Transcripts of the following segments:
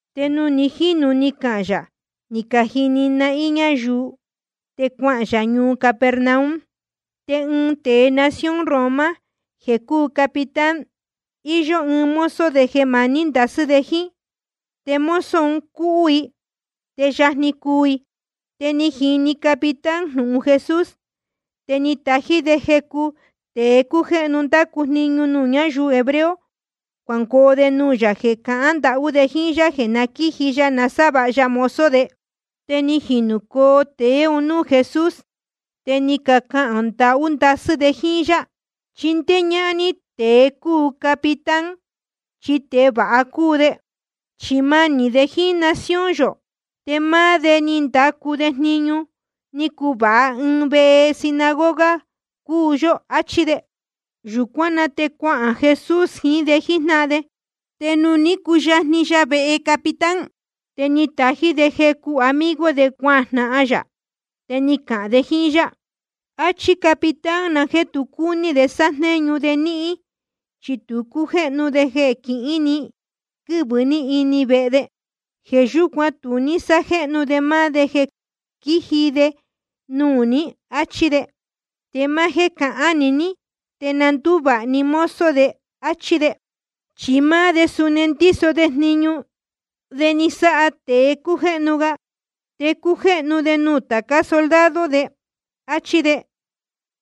Te nuū ni jínu ni cahān yā ni cajini nahín ñáyuu ún, te cuahān yā ñuu Capernaum. Te ɨɨn tēe nación Roma jeē cúu capitán, íyó ɨɨn mozo de jeē manī ndasɨ́ de jíín. Te mozo un cúhú i te je yajni cuu i. Te ni jini capitán jnūhun Jesús. Te ni tají de jecu tēe jéhnu cándacu jniñu nuū ñáyuu hebreo, cuangoo de nuū yā jeē cahán ndahú de jíín yá jeē na quíji ya sávāha ya mozo de. Te ni jinūcoo tēe un núū Jesús, te ni cacahān ndahú ndasɨ́ de jíín yá: Chindéé ñáhán ní tēe cúu capitán, chi tēe vāha cúu de. Chi manī de jíín nación yō, te máá de ni ndacu jniñu ni cuvāha ɨɨn vehe sinagoga cuu yó. Achí de. Yūcuán na te cuahān Jesús jiín de jíjnáhan de. Te nuū ní cuyajni ya vehe capitán, te ni tají de jecu amigo de cuajnahan yā. Te ni cacahān de jíín yá: Achí capitán jeē tu cúní de sájnéñu de níhín, chi tu cújéhnu de jeē quihín ni quɨ́vɨ ní vehe de. Jeē yúcuan tu ní sájéhnu de máá de jeē quíji de nuū ní, áchí de. Te máá jéē cahán‑ni ní, te na ndúvāha‑ni mozo de, áchí de. Chi máá de suni ndíso jníñu de ni casáha tēe cácujéhnu ga. Te cújéhnu de nuū tācá soldado de, áchí de.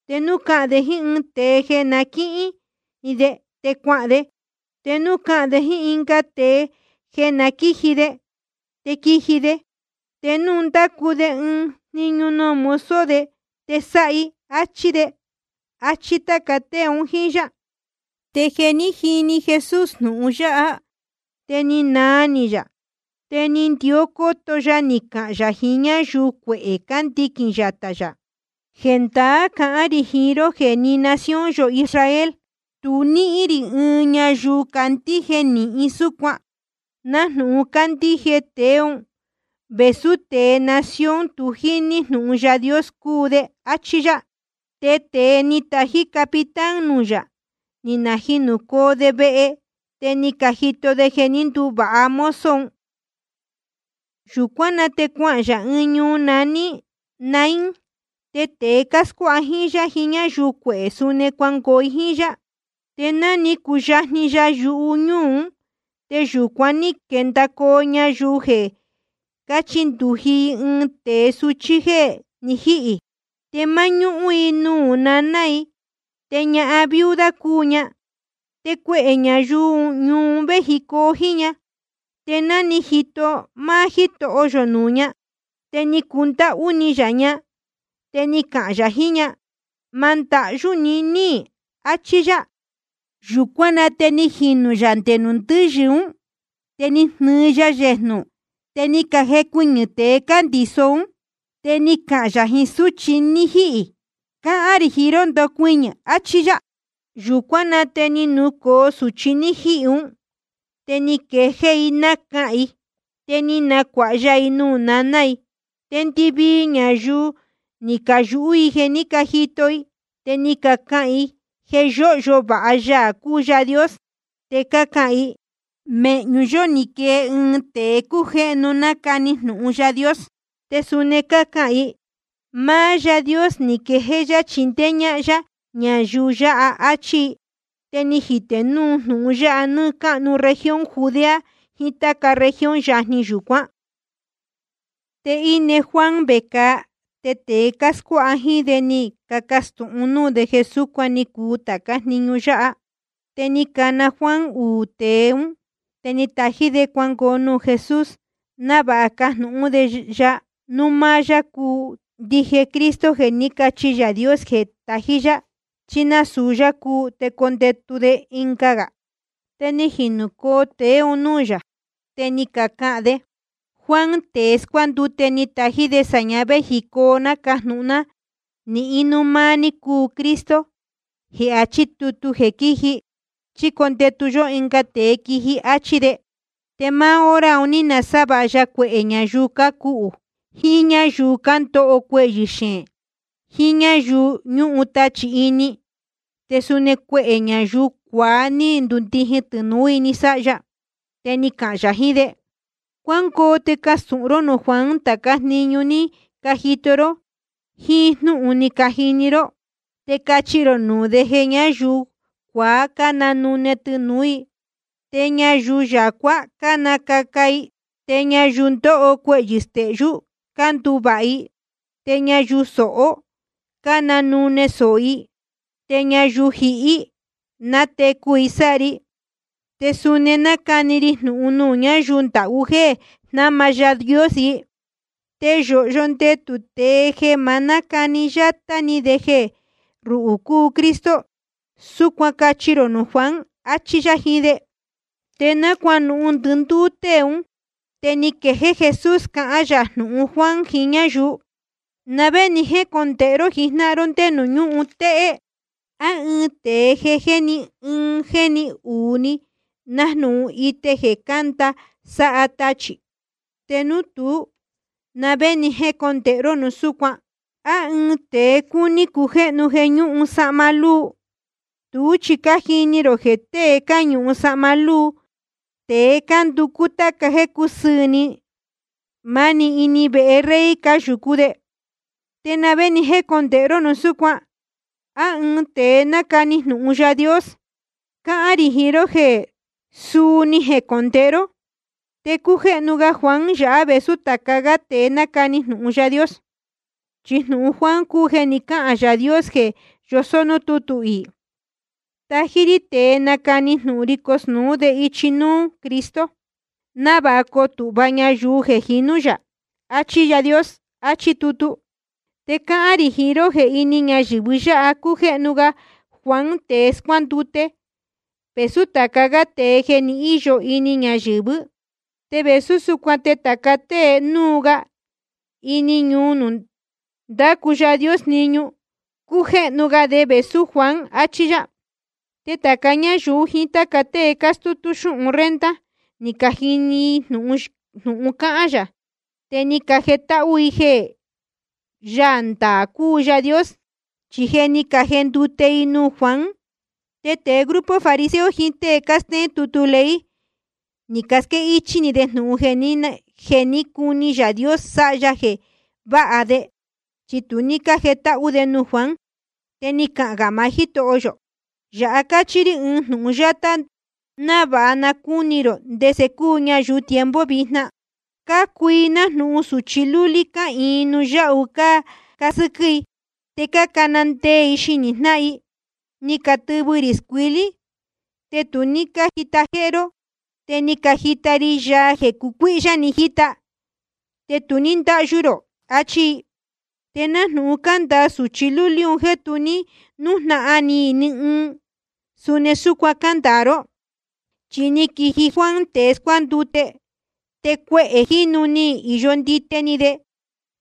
Te núu cáhán de jíín ɨɨn tēe jeē na quíhín de, te cuahān de. Te núu cáhán de jíín ɨnga tēe jeē na quíji de, te quíji de. Te núu ndácu de ɨɨn jniñu nuū mozo de, te sáha i, áchí de. Achí táca tée un jíín yá. Te jeē ní jini Jesús jnūhun yáha, te ni naa ni yā. Te ni ndió cóto ya ni cahān yā jiín ñáyuu cuehē cándiquīn yatā yā: Jendaá cahán rī jiín ró jeē ni nación yō Israel tu ní níhín rī ni ɨɨn ñayuu candíje nīhin súcuan, nájnūhun cándíje tēe ún, vēsú tēe nación tu jíní jnūhun Yaā Dios cúu de. Achí yá. Te tēe ni tají capitán nuū yā, ni najinūcoo de vehe, te ni cajito de jeē jé ni nduvāha mozo un. Yūcuán na te cuahān yā ɨɨn ñuu naní Naín. Te tēe cáscuáha jíín yá, jiín ñáyuu cuehē, suni cuangoo i jíín yá. Te ná ni cuyajni ya yuñúū ún, te yūcuan ní quendacoo ñayuu jeē quíchindūji i ɨɨn tēe suchí jéē ni jíhī. Te máñúhún‑ni i nuū naná i, te ñahan viuda cúu ña. Te cuehē ñayuu ñuu un véjicoo jíín ña. Te ná ni jito máá Jítoho yō nuū ña, te ni cundáhú ni yā ña, te ni cahān yā jiín ña: Ma ndahyú ni, áchí yá. Yūcuán na te ni jinū yā nde nuū ndɨ́yɨ ún, te ni jnɨɨ ya yejnū, te ni cajecuɨñɨ̄ tēe cándiso ún. Te ni cahān yā jiín súchi ní jihī: Cáhán rī jiín ró, ndocuɨñɨ̄, achí yá. Yūcuán na te ni nucōo sūchi ní jihī ún, te ni quejéé i nácahān i. Te ni nacuāha ya i nuū naná i. Te ndɨvii ñayuu ni cayūhú i jeē ní cajito i, te ni cacahān i jeē yóhyo vāha Yaā cúu Yaā Dios. Te cácahān i: Mēhñu yó ni quee ɨɨn tēe cújéhnu nácani jnūhun Yaā Dios. Te suni cácahān i: Máá Yaā Dios ni quejéé yá chindéé ñáhán yá ñayuu yā. Achí i. Te ni jitē núu jnūhun ya nɨɨ́ cáhnu región Judea jiín táca región yajni yūcuán. Te íne Juan vecāa, te tēe cáscuáha jíín de ni cacastūhun núū de jeē súcuan ni cuu tācá jniñu yáha. Te ni cana Juan uū tēe ún, te ni tají de cuangoo nuū Jesús, návāha cajnūhún de ya núu máá yá cúu ndije Cristo jeē ní cachi Yaā Dios jeē tají yá, chí núu nasūu yá cúu te condetu de ɨnga. Te ni jinūcoo tēe un núū yā, te ni cacahān de: Juan tēe scuándute ni tají de sāña véjicoo ná cajnūhun ná nihín núu máá ní cúu Cristo jeē achí tutu jeē quíji, chí condetu yó ɨnga tēe quiji. Achí de. Te máá hora un ní nasávāha ya cuehē ñayuu cácuhū, jiín ñáyuu cándoho cuehyɨ̄ xeēn, jiín ñáyuu ñúhun tachī ini. Te suni cuehē ñayuu cuaá ní ndundijin tɨnūú i ni sáha ya. Te ni cahān yā jiín de: Cuángoo te castūhun ró nuū Juan tācá jniñu ni cajito ró jíín jnúhun ni cajini ró. Te cachi rō nuū de jeē ñáyuu cuaá cánanune tɨnūú i, te ñayuu yacuá cánacaca i, te ñayuu ndóho cuehyɨ̄ stehyú cánduvāha i, te ñayuu sohó cánanune sōho i, te ñayuu jihí nátecu i sáha ri. Te suni nácani ri jnūhun nuū ñáyuu ndahú jéē jnama Yaā Dios i. Te yōhyo ndetū tēe jeē ma nácani yátá ni de jeē ruhū cúu Cristo. Súcuan cachi rō nuū Juan. Achí yá jiín de. Te ná cuanuhun ndɨndúú tée ún, te ni quejéé Jesús cahán yā jnūhun Juan jiín ñáyuu: ¿Na vé ni jécondēhe ró jijnáhan ró ndé nuū ñúhun téhé? ¿A ɨɨn tēe jéni ɨɨn jéni uū ni, nájnūhun ite jeē cánda sáha tachī? Te núu tuú, ¿te na vé ni jécondēhe ró núu súcuan? ¿A ɨɨn tēe cúní cujéhnu jeē ñúhun sahma lúu? Tuú chi cájini rō jeē tée cáñuhun sahma lúu te cánducú tāca jéē cúsɨɨ̄ ni, máni ini vehe rey cáyūcú de. ¿Te na vé ni jécondēhe ró núu súcuan? ¿A ɨɨn tēe nácani jnūhun Yaā Dios? Cáhán rī jiín ró jeē suu ni jecondēhe ró. Te cújéhnu ga Juan yáha vēsú tāca gá tēe ni canacani jnūhun Yaā Dios. Chi jnūhun Juan cúu jeē ni cáhān Yaā Dios jeē yosó núū tútu iī: Tají rí tēe nacani jnūhun ri cosnūú de ichi núú Cristo, návāha coo tūhva ñayuu jeē jinú yā. Achí Yaā Dios, achí tutu. Te cáhán rī jiín ró jeē ini ñayɨ̄vɨ yáha cújéhnu ga Juan tēe scuándute vēsú tāca gá tēe jeē ni íyo ini ñayɨ̄vɨ́. Te vēsú súcuan te tāca tée núu ga ini ñuu nuū ndácu Yaā Dios jniñu, cújéhnu ga de vēsú Juan. Achí yá. Te tāca ñáyuu jiín táca tée cástútú xúhun renta, ni cajini i jnūhun cáhán yā, te ni cajetáhú i jeē Yaā ndaā cúu Yaā Dios, chi je ni cajendute i nuū Juan. Te tēe grupo fariseo jiín tée cástéén tutu ley, ni casquéhichī de jnūhun jeē cuní Yaā Dios sáha ya jeē váha de, chi tu ní cájendute de nuū Juan. Te ni cahān gā maá Jítoho yō: Yāhá cachi rī ɨɨn jnūhun yátá návāha na cúni rō ndese cúu ñayuu tiempo vijna. Cúu i nájnūhun sūchi lúlí cáhīin nuū yáhu cácasɨ́quɨ́ i. Te cácana ndee i xinī jnáhan i: Ni catɨvɨ rī scuilí, te tu ní cájita jéhé ró. Te ni cajita ri yaa jeē cuihyá jíta, te tu ní cándahyū rō, achí i. Te nájnūhun cándāa sūchi lúlí un jéē tu ní nújnahan ni i ni ɨɨn, suni súcuan cándāa ró. Chi ni quiji Juan tēe scuándute, te cuehē jínu ni īyo ndite ni de,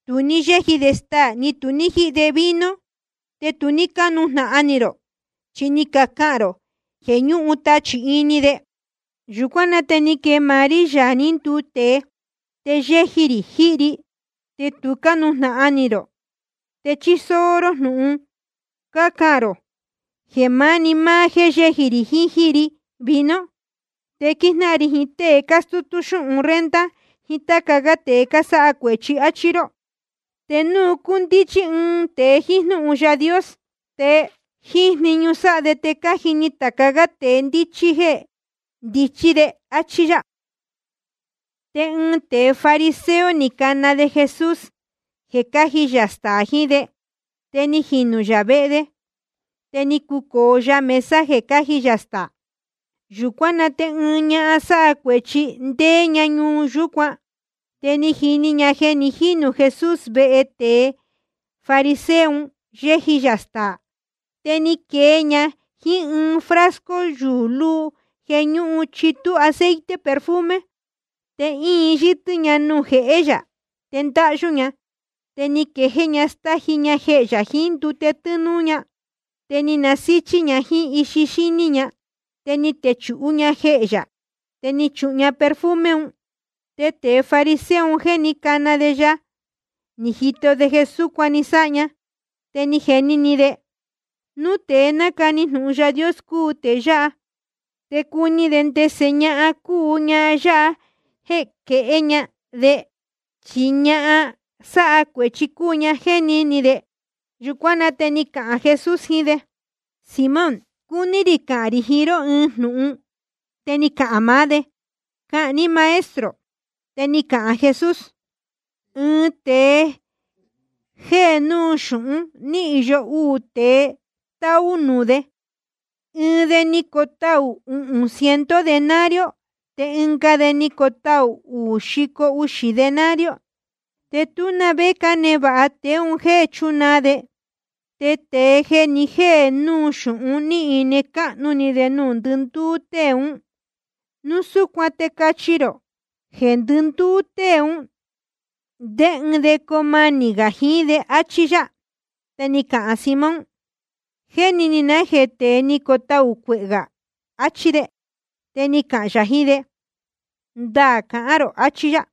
tu ní yéji de staā ni tu ní jíhi de vino. Te tu ní cánujnahan ni rō, chi ni cacahān rō jeē ñúhun tachī ini de. Yūcuán na te ni quee máá rí, Yaā ní nduu tēe, te yéji rī jíhi ri, te tu cánujnahan ni rō, te chísóó jnúhun ró cácahān rō jeē máni máá jéē yéji rī jíhi ri vino. Te quíjnáhan ri jiín tée cástútú xúhun renta jiín táca gá tēe cásáha cuēchi, áchí ró. Te núu cúndíchí ɨɨn tēe jíín jnúhun Yaā Dios, te jíín jniñu sáha de te cájini tāca gá tēe ndíchí jeē ndichí de. Achí yá. Te ɨɨn tēe fariseo ni cana de Jesús jeē cáji yā staā jiín de. Te ni jinū yā vehe de, te ni cucōo ya mesa jeē cáji yā staā. Yūcuán na te ɨɨn ñahan sáha cuēchi, ndéé ña ñuu yúcuan, te ni jini ña jeē ni jínū Jesús vehe tēe fariseo un, yéji yā staā. Te ni quee ña jíín ɨɨn frasco yuū luu jeē ñúhun chitú aceite perfume. Te íin yɨ́tɨ́ ña nuū jehé yā, te ndáhyú ña. Te ni quejéé ña stáji ña jehē yā jiín ndute tɨ́núú ña, te ni nasíchí ña jíín ixi xíní ña. Te ni techūhú ña jehē yā, te ni chuhun ña perfume un. Te tēe fariseo un jeē ní cana de ya, ni jito de jeē súcuan ni sáha ña, te ni jeni ni de: Núu tēe nácani jnūhun Yaā Dios cúu tēe yáha, te cuni de ndese ñahan cúu ñahan yáha jeē quehé ña de, chi ñahan sáha cuēchi cúu ña, jéni ni de. Yūcuán na te ni cahān Jesús jiín de: Simón, cúní rī cahān rī jiín ró ɨɨn jnūhun. Te ni cahān maá de: Cahān ní, Maestro. Te ni cahān Jesús: Ɨɨn tēe jéhe núu xūhún, ni īyo uū tēe táú nuū de. Ɨɨn de ni cotaū uhūn ciento denario, te ɨnga de ni cotaū uū xico uxī denario. Te tú na vé cánevāha tēe un jéē náchunaa de. Te tēe jéhe núu xūhun ní ine cáhnu ni de nuū ndɨndúú tée ún. Núu súcuan te cachi rō: Jeē ndɨndúú tée ún, ¿ndé ɨɨn de coo manī gā jiín de? Achí yá. Te ni cahān Simón: Jéni ni na jéē tée ni cotaū cuehē gā, achí de. Te ni cahān yā jiín de: Ndaā cahán rō, achí yá.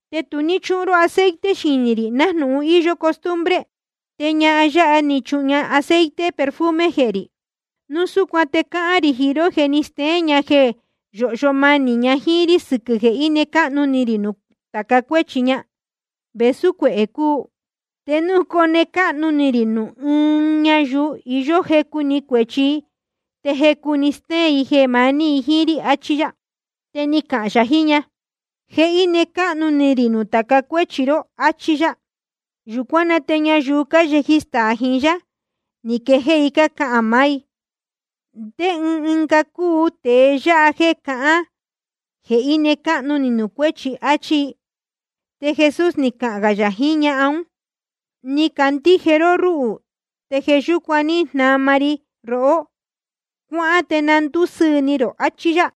Te tu ní chúhun ró aceite xinī rī nájnūhun íyó costumbre. Te ñahan yáha ní chuhun ña aceite perfume jehē rī. Núu súcuan te cáhán rī jiín ró jeē ni stéén ña jeē yóhyo manī ña jíín rí sɨquɨ̄ jeē íne cáhnu ni rī nuū tāca cuéchi ña, vēsú cuehē cúu. Te núu cone cáhnu ni rī nuū ɨɨn ñayuu iyó jecu‑ni cuēchi, te jecu‑ni stéén i jeē maní i jíín rí, achí yá. Te ni cahān yā jiín ña: Je íne cáhnu ni rī nuū tāca cuéchi ró, áchí yá. Yūcuán na te ñayuu cáyeji staā jiín yá, ni quejéé i cácahān maá i: ¿Ndé ɨɨn ga cúu tēe yáha jéē cahán jeē íne cáhnu ni nuū cuéchi? áchí i. Te Jesús ni cahān gā yā jiín ñahan ún: Ni candíje ró rúhū, te jeē yúcuan ní jnama ri rohó. Cuáhán te na ndúsɨɨ̄ ni rō. Achí yá.